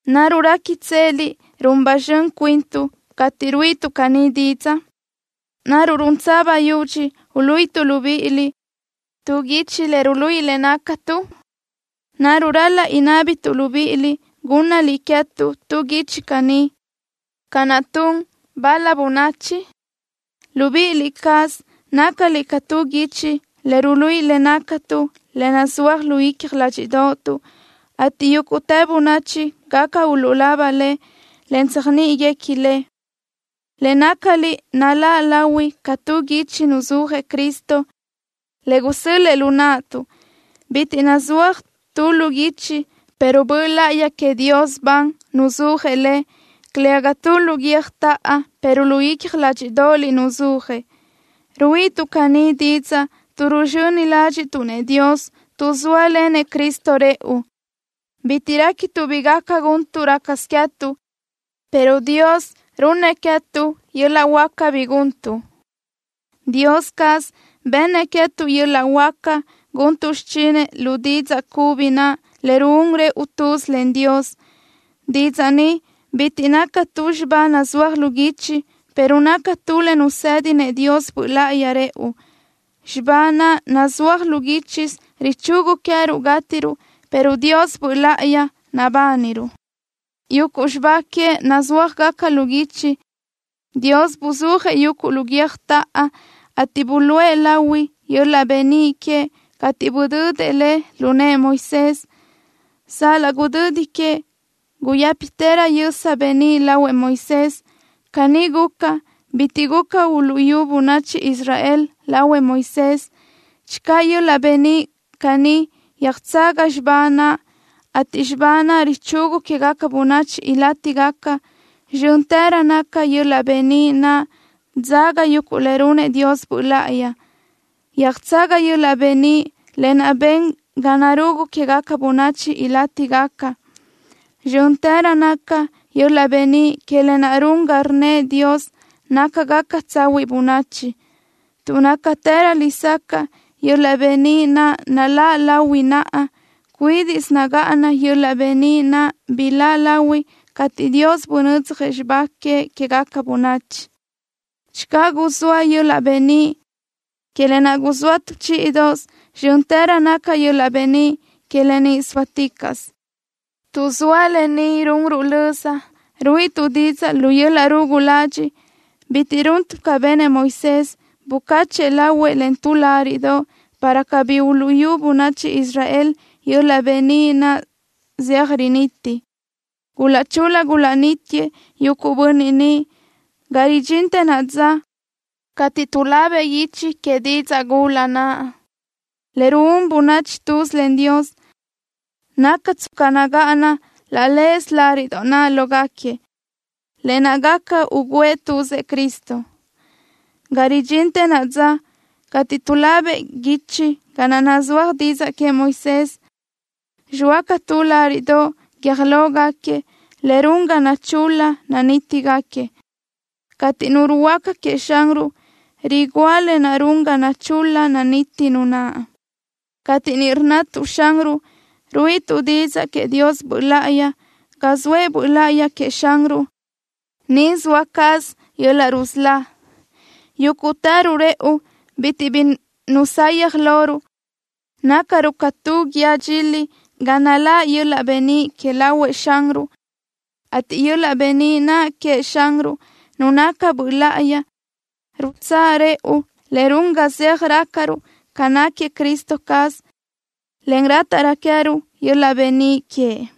¿Naruʼ réquitseliʼ run ba zxön cuintuʼ cateʼ ruíʼituʼ caní didzaʼ? ¿Naruʼ runtsö bayudxi uluíʼituʼ libíʼiliʼ tu guichi le ruluíʼi le nácatuʼ? ¿Naruʼ ral-laʼ inábituʼ libíʼiliʼ gúnnaliʼ queë́tuʼ tu guichi caní, ca naʼ tun bal-la bönachi? Libíʼi cázaliʼ nácaliʼ ca tu guichi le ruluíʼi le nácatuʼ, le nazúaj lu icja ládxiʼdoʼotuʼ, ateʼ yúguʼtë bönachi gaca uluʼlaba le, en tséajniʼiguequi le. Le nácaliʼ naláʼ lahui ca tu guichi nuzúajëʼ Cristo, le gusö́l-lëʼë lu naʼtuʼ. Bitiʼ nazúaj tu lu guichi, pero Böʼ Láʼayi queëʼ Dios ban nuzúajëʼ le, calëga tu lu guiö́jtaʼa, pero lu icja ládxiʼdoʼoliʼ nuzúajëʼ. Ruíʼituʼ caní didzaʼ tuʼ ruzxöni ládxiʼtuʼ-nëʼ Dios tuʼ zóalenëʼ Cristo rëʼu. Bitiʼ réquituʼ bi gaca guntuʼ rácasö queë́tuʼ, pero Dios runnëʼ queë́tuʼ yöl-laʼ huáca bi guntuʼ. Dios caz bennëʼ queë́tuʼ yöl-laʼ huáca guntuʼ xichinëʼ lu didzaʼ cubi naʼ, le ruún rëʼu tuz len Dios. Didzaʼ ni bitiʼ naca tu xibá nazúaj lu guichi, pero naca tu le nusë́dinëʼ Dios Böʼ Láʼayi rëʼu. Xibá naʼ nazúaj lu guíchisö richugu queë́ruʼ gátiruʼ, pero Dios Böʼ Láʼayi nabániruʼ. Yuguʼ xibá queëʼ nazúajgaca lu guichi, Dios buzúajëʼ yuguʼ lu guiö́jtaʼa, ateʼ buluʼe lahui yöl-laʼ beníʼ queëʼ cateʼ budödëʼ le lu nëʼë Moisés. Sal-laʼ gudödi que, guyë́pitërö yösa beníʼ lahuëʼ Moisés. Caní guca, bitiʼ guca uluʼyú bönachi Israel lahuëʼ Moisés. Channö yöl-laʼ beníʼ caní yöjtsaga xibá naʼ, ateʼ xibá naʼ richugu quégaca bönachi ilátigaca, zxö́ntërö naca yöl-laʼ beníʼ naʼ dzaga yuguʼ le runëʼ Dios Böʼ Láʼayi. Yöjtsaga yöl-laʼ beníʼ lë naʼ ben ga narugu quégaca bönachi ilátigaca. Zxö́ntërö naca yöl-laʼ beníʼ que lë naʼ run ga rnnëʼ Dios nácagaca tsahuiʼ bönachi. Tuʼ nácatërö lesacaʼ yöl-laʼ beníʼ naʼ naláʼ lahui naʼa, cuídiʼsö nagáʼana yöl-laʼ beníʼ naʼ biláʼ lahui cateʼ Dios bunödzjëʼ xibá queëʼ quégaca bönachi. Channö guzóa yöl-laʼ beníʼ que lë naʼ guzóa tu chíʼidoʼosö, zxö́ntërö naca yöl-laʼ beníʼ que lë ni sóaticaʼsö. Tuʼ zoa lë ni runruʼ löza, ruíʼituʼ didzaʼ lu yöl-laʼ rugu ladxiʼ. Bitiʼ runtuʼ ca benëʼ Moisés, bucacheʼ lahuëʼ len tu láriʼdoʼ, para cabí uluʼyú bönachi Israel yöl-laʼ beníʼ naʼ zeaj riniti. Gulaʼchul-la gulaʼnítiëʼ yuguʼ bönniʼ niʼ. Ga ridxintë naʼa dza cateʼ tuʼlabëʼ guichi que didzaʼ gula naʼ le ruún bönachi tuz len Dios, naca tsca nagáʼana laʼ leze láriʼdoʼ naʼ lógaquiëʼ, lë naʼ gaca ugǘëʼ tuzëʼ Cristo. Ga ridxintë naʼa dza, cateʼ tuʼlabëʼ guichi ga naʼ nazúaj didzaʼ queëʼ Moisés, zxoa ca tu láriʼdoʼ guiö́j lógaquiëʼ le run ga nachul-la nanítigaquiëʼ. Cateʼ nu ruhuöáca queëʼ Xanruʼ, rigúa lë naʼ run ga nachul-la naniti nu naʼ. Cateʼ ni rnnatuʼ: “Xanruʼ”, ruíʼituʼ didzaʼ queëʼ Dios Böʼ Láʼayi. Ga zoëʼ Böʼ Láʼayi queëʼ Xanruʼ, niʼ zoa caz yöl-laʼ nadzán. Yúguʼtëruʼ rëʼu bitiʼ bi nusayaj loruʼ. Nácaruʼ ca tu guíë dxili ga naláʼ yöl-laʼ beníʼ que lahuëʼ Xanruʼ, ateʼ yöl-laʼ beníʼ naʼ queëʼ Xanruʼ, Nu naca Böʼ Láʼayi, rutsáʼ rëʼu, en run ga zeaj rácaröruʼ ca náquiëʼ Cristo caz, en rátaʼrö queë́ruʼ yöl-laʼ beníʼ queëʼ.